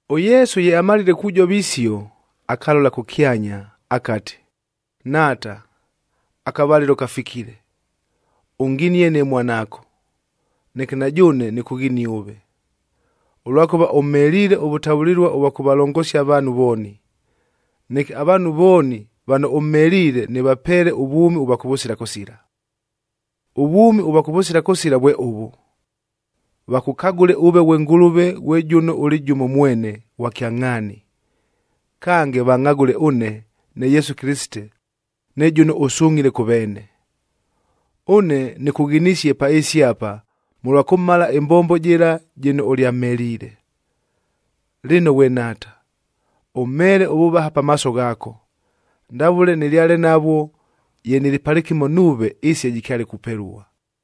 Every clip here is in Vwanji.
ɄYesu ye amalile kujova isio, akalola kʉkyanya akati, “Nhaata, akavalɨlo kafikile! Ʉnginie ne mwanaako, neke na jʉʉne nɨkʉghinie ʉve, ʉlwakʉva ʉmheliile ʉvʉtavʉlɨlua ʉvwa kʉvalongosia avaanhu vooni, neke avaanhu vooni vano ʉmheliile nɨvapeele ʉvwʉmi ʉvwa kʉvʉsila kʉsila. Ʉvwʉmi ʉvwa kʉvʉsila kʉsila vwe ʉvʉ: Vakʉkagʉle ʉve ghwe Ngʉlʉve ghwe jʉno ʉlɨ jʉmo mwene ghwa kyangʼhaani, kange vangʼhagʉle ʉne ne Yesu Kɨlɨsite ne jʉno ʉsungʼhile kʉ veene. Ʉne nɨkʉghinisie pa ɨɨsi apa mʉlwa kʉmala ɨmbombo jɨla jɨno ʉlyamheliile. Lɨno ghwe Nhaata, ʉmheele ʉvʉvaha pamaaso ghaako, ndavʉle nɨlyale navwo ye nɨlɨ palɨkɨmo nuuve ɨɨsi ye jɨkyale kupelua.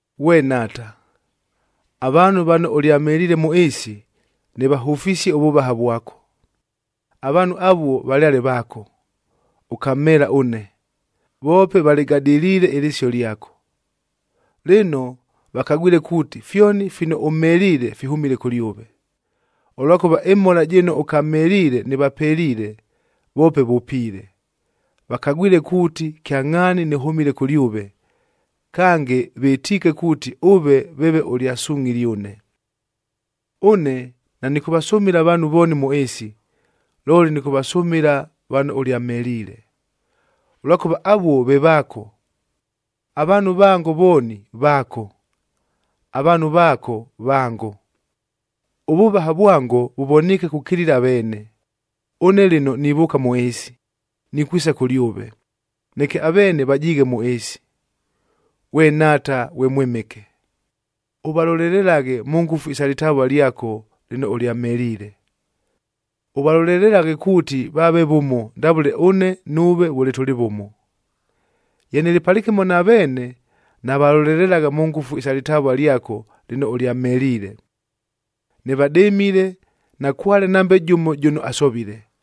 “Ghwe Nhaata, avaanhu vano ʉlyamheliile mʉ ɨɨsi, nɨvahʉfisie ʉvʉvaha vwako. Avaanhu avuo valyale vaako, ʉkamheela ʉne, voope valɨgadɨliile ɨlɨsio lyako. Lɨno vakagwile kuuti, fyoni fino ʉmheliile fihʉmile kʉlyʉve, ʉlwakʉva ɨmhola jɨno ʉkamheliile nɨvapeliile, voope vʉpiile. Vakagwile kuuti kyangʼhaani nɨhʉmile kʉlyʉve, kange vɨtiike kuuti ʉve veeve ʉlyasungʼhile ʉne. “Ʉne nanɨkʉvasʉmɨla avaanhu vooni mʉ ɨɨsi, looli nɨkʉvasʉmɨla vano ʉlyamheliile, ʉlwakʉva avuo ve vaako. Avaanhu vango vooni, vaako; avaanhu vaako, vango. Ʉvʉvaha vwango vʉvoniike kukilila aveene. Ʉne lɨno nivʉʉka mʉ ɨɨsi, nikwisa kʉlyʉve, neke aveene vajiighe mʉ ɨɨsi. Ghwe Nhaata ghwe Mwɨmɨke, ʉvalolelelaghe mʉ ngʉfu isa lɨtavua lyako lɨno ʉlyamheliile. Ʉvalolelelaghe kuuti vaave vʉmo ndavʉle ʉne nuuve vʉle tʉlɨ vʉmo. Ye nɨlɨ palɨkɨmo na veene, navalolelelagha mʉ ngʉfu isa lɨtavua lyako lɨno ʉlyamheliile. Nɨvadɨmile, nakwale nambe jʉmo jʉno asovile,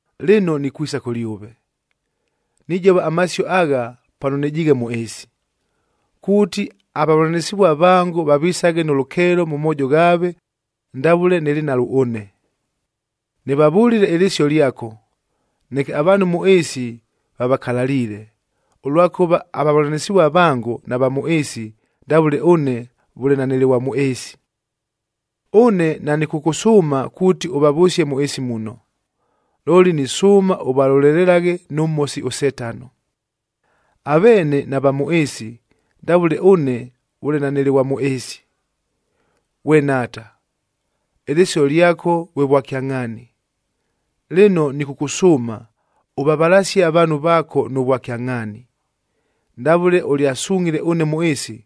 “Lɨno nikwisa kʉlyʉve, nijova amasio agha pano nɨjiighe mʉ ɨɨsi, kuuti avavʉlanɨsɨvua vango vavisaghe nʉ lʉkeelo mʉ moojo ghaave ndavʉle nɨlɨ nalwo ʉne. Nɨvavʉlile ɨlɨsio lyako, neke avaanhu mʉ ɨɨsi vavakalaliile, ʉlwakʉva avavʉlanɨsɨvua vango nava mʉ ɨɨsi ndavʉle ʉne vʉle nanɨlɨ ghwa mʉ ɨɨsi. “Ʉne nanɨkʉkʉsʉʉma kuuti ʉvavʉsie mʉ ɨɨsi muno, looli nisʉʉma ʉvalolelelaghe nʉ Mhosi ʉSetano. Aveene nava mʉ ɨɨsi, ndavʉle ʉne vʉle nanɨlɨ ghwa mʉ ɨɨsi. Ghwe Nhaata, ɨlɨsio lyako vwe vwakyangʼhaani, lɨno nɨkʉkʉsʉʉma ʉvavalasie avaanhu vaako nʉ vwakyangʼhaani. Ndavʉle ʉlyasungʼhile ʉne mʉ ɨɨsi,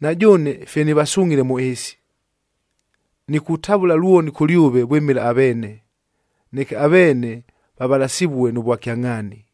na jʉʉne fye nɨvasungʼhile mʉ ɨɨsi. Nikutavʉla lwoni kʉlyʉve vwɨmɨla aveene, neke aveene vavalasɨvue nʉ vwakyangʼhaani.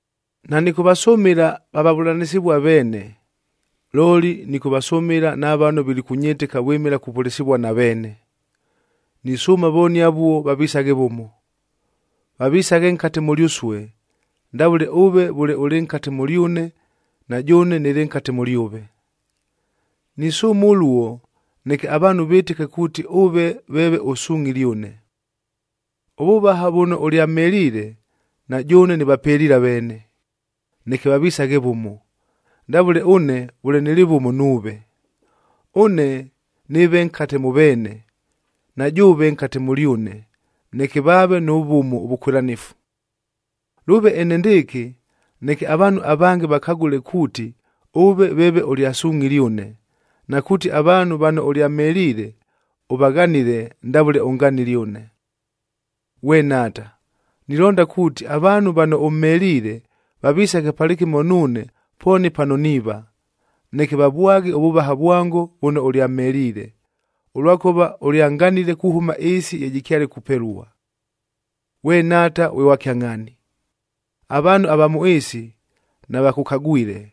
“Nanɨkʉvasʉmɨla va vavʉlanɨsɨvua veene, looli nɨkʉvasʉmɨla na vano vilikʉnyɨtɨka vwɨmɨla kupʉlɨsɨvua na veene. Nisʉʉma vooni avuo vavisaghe vʉmo, vavisaghe nkate mʉlyʉsue, ndavʉle ʉve vʉle ʉlɨ nkate mʉlyʉne na jʉʉne nɨlɨ nkate mʉlyʉve. Nisʉʉma ʉluo, neke avaanhu vɨtɨke kuuti ʉve veeve ʉsungʼhile ʉne. Ʉvʉvaha vʉno ʉlyamheliile, na jʉʉne nɨvapeliile aveene, neke vavisaghe vʉmo, ndavʉle ʉne vʉle nɨlɨ vʉmo nuuve. Ʉne nɨɨve nkate mʉ veene, na jʉʉve nkate mʉlyʉne neke vaave nʉ vʉmo ʉvʉkwɨlanɨfu. Lʉʉve enendɨɨkɨ neke avaanhu avange vakagʉle kuuti, ʉve veeve ʉlyasungʼhile ʉne, na kuuti avaanhu vano ʉlyamheliile, ʉvaghanile ndavʉle ʉnganile ʉne. “Ghwe Nhaata, nilonda kuuti, avaanhu vano ʉmheliile vavisaghe palɨkɨmo nuune pooni pano niiva, neke vavwaghe ʉvʉvaha vwango vʉno ʉlyamheliile, ʉlwakʉva ʉlyanganile kuhʉma ɨɨsi ye jɨkyale kupelua. Ghwe Nhaata ghwe ghwa kyangʼhaani, avaanhu ava mʉ ɨɨsi navakʉkagwile,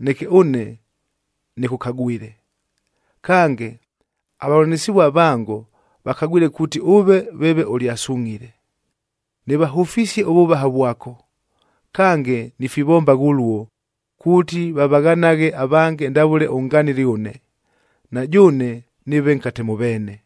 neke ʉne nɨkʉkagwile. Kange, avavʉlanɨsɨvua vango vakagwile kuuti ʉve veeve ʉlyasungʼhile. Nɨvahʉfisie ʉvʉvaha vwako, kange nifivombagha ʉluo kuuti vavaghanaghe avange ndavʉle ʉnganile ʉne, na jʉʉne nɨɨve nkate mʉ veene.”